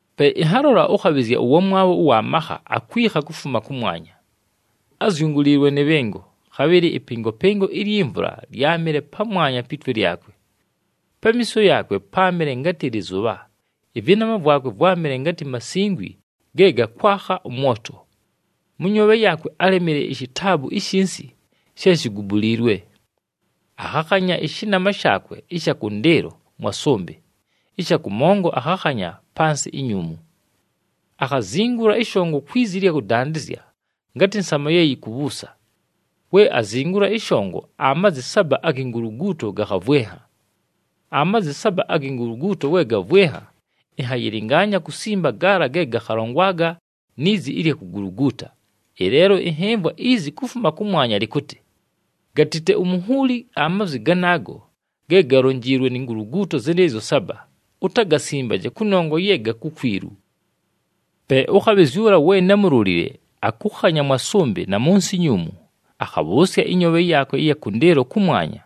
Pe ɨnhalola ʉkhabhɨzya ʉwamwabho ʉwa makha, akwikha kufuma kʉmwanya. Ázyunguliilwe nɨ bhɨngo, khabhɨlɨ ɨpɨngopɨngo ilyi mvula lyámɨle pamwanya pi twe lyakwe. Pamiiso yaakwe páamɨle ngatɨ lɨzʉbha, ɨvɨnama vwakwe vwámɨle ngatɨ masingwi ge gakwakha ʉmwoto. Mʉ nyoobhe yaakwe álemile ishitaabu ishinsi she shigubuliilwe. Akhakhanya ɨshɨnama shaakwe ɨsha kʉndɨɨlo mwa sʉmbɨ, ɨsha kʉmongo akhakhanya pa nsɨ inyuumu. Akhazingula ɨshongo kwi zi ɨlya kʉdandɨzya, ngatɨ nsama ye yikubhuusa. We azingula ɨshongo, amazi saba agi nguluguuto gakhavwɨnha. Amazi saba agi nguluguuto we gavwɨnha, ɨnhayɨlɨngaanya kusimba gaala ge gakhalongwaga ni zi ɨlya kuguluguuta, ɨleelo ɨnhɨmvwa izi kufuma kʉmwanya lɨkʉtɨ, “Gatite umunhuuli amazwi ganaago ge galonjiilwe ni nguluguuto zɨnɨɨzyo saba, utagasimbaje, kʉnongwa ye ga kukwilu.” Pe ʉkhabhɨzya ʉla we námulolile akʉkhanya mwa sʉmbɨ na mʉ nsɨ inyuumu, akhabhʉʉsya ɨnyoobhe yaakwe ɨya kʉndɨɨlo kʉmwanya.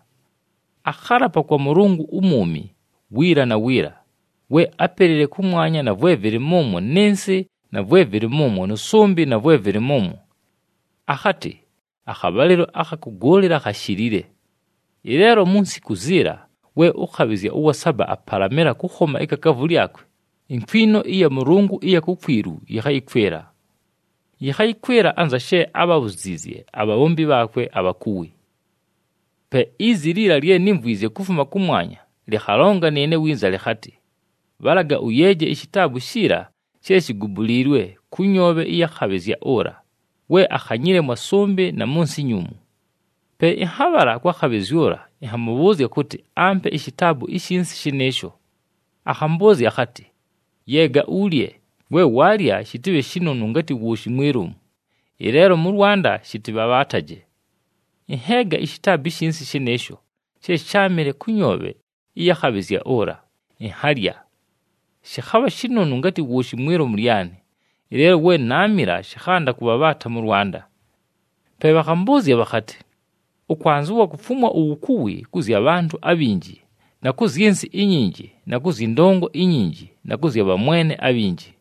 Akhalapa kwa Mʉlʉngʉ umwumi wiila na wiila, we ápelile kʉmwanya na vwe vɨlɨ mʉmwo nɨ nsɨ na vwe vɨlɨ mʉmwo nʉ sʉmbɨ na vwe vɨlɨ mʉmwo. Akhatɨ, “Akhabhalɨlo akha kʉgʉʉlɨla khashilile. Ɨleelo mu nsiku ziila we ʉkhabhɨzya ʉwa saba apalamɨla kʉkhoma ikakaavu lyakwe, inkwino ɨya Mʉlʉngʉ ɨya kukwilu yɨkhayɨkwɨla. Yɨkhayɨkwɨla anza she ábhabhuziizye abhabhombi bhaakwe abhakuwi.” Pe izi liila lye nímvwizye kufuma kʉmwanya lɨkhalonga nɨɨne winza lɨkhatɨ, “Bhalaga ʉyeeje ishitaabu shiila she shigubuliilwe kʉ nyoobhe ɨya khabhɨzya ʉla, we akhanyile mwa sʉmbɨ na mʉ nsɨ inyuumu.” Pe ɨnhabhala kwa khabhɨzya ʉla ɨnhamʉbhʉʉzya kʉtɨ, ampe ishitaabu ishinsi shɨnɨɨsho. Akhambʉʉzya akhatɨ, “Yeega ulye. We waalya, shɨtɨbhe shinonu ngatɨ wooshi mwi lomu, ɨleelo mʉ lwanda shɨtɨbhabhaataje.” Ɨnheega ishitaabu ishinsi shɨnɨɨsho she sháamɨle kʉ nyoobhe ɨya khabhɨzya ʉla, ɨnhalya. Shɨkhabha shinonu ngatɨ wooshi mwi lomu lyanɨ, ɨleelo we naamila shɨkhanda kʉbhabhaata mʉ lwanda. Pe bhakhambʉʉzya bhakhatɨ, “Ʉkwanzɨwa kufumwa uwukuwi kʉ zya bhantʉ abhinji na kʉ zyɨ nsɨ inyinji na kʉ zyɨ ndongo inyinji na kʉ zya bhamwene abhinji.”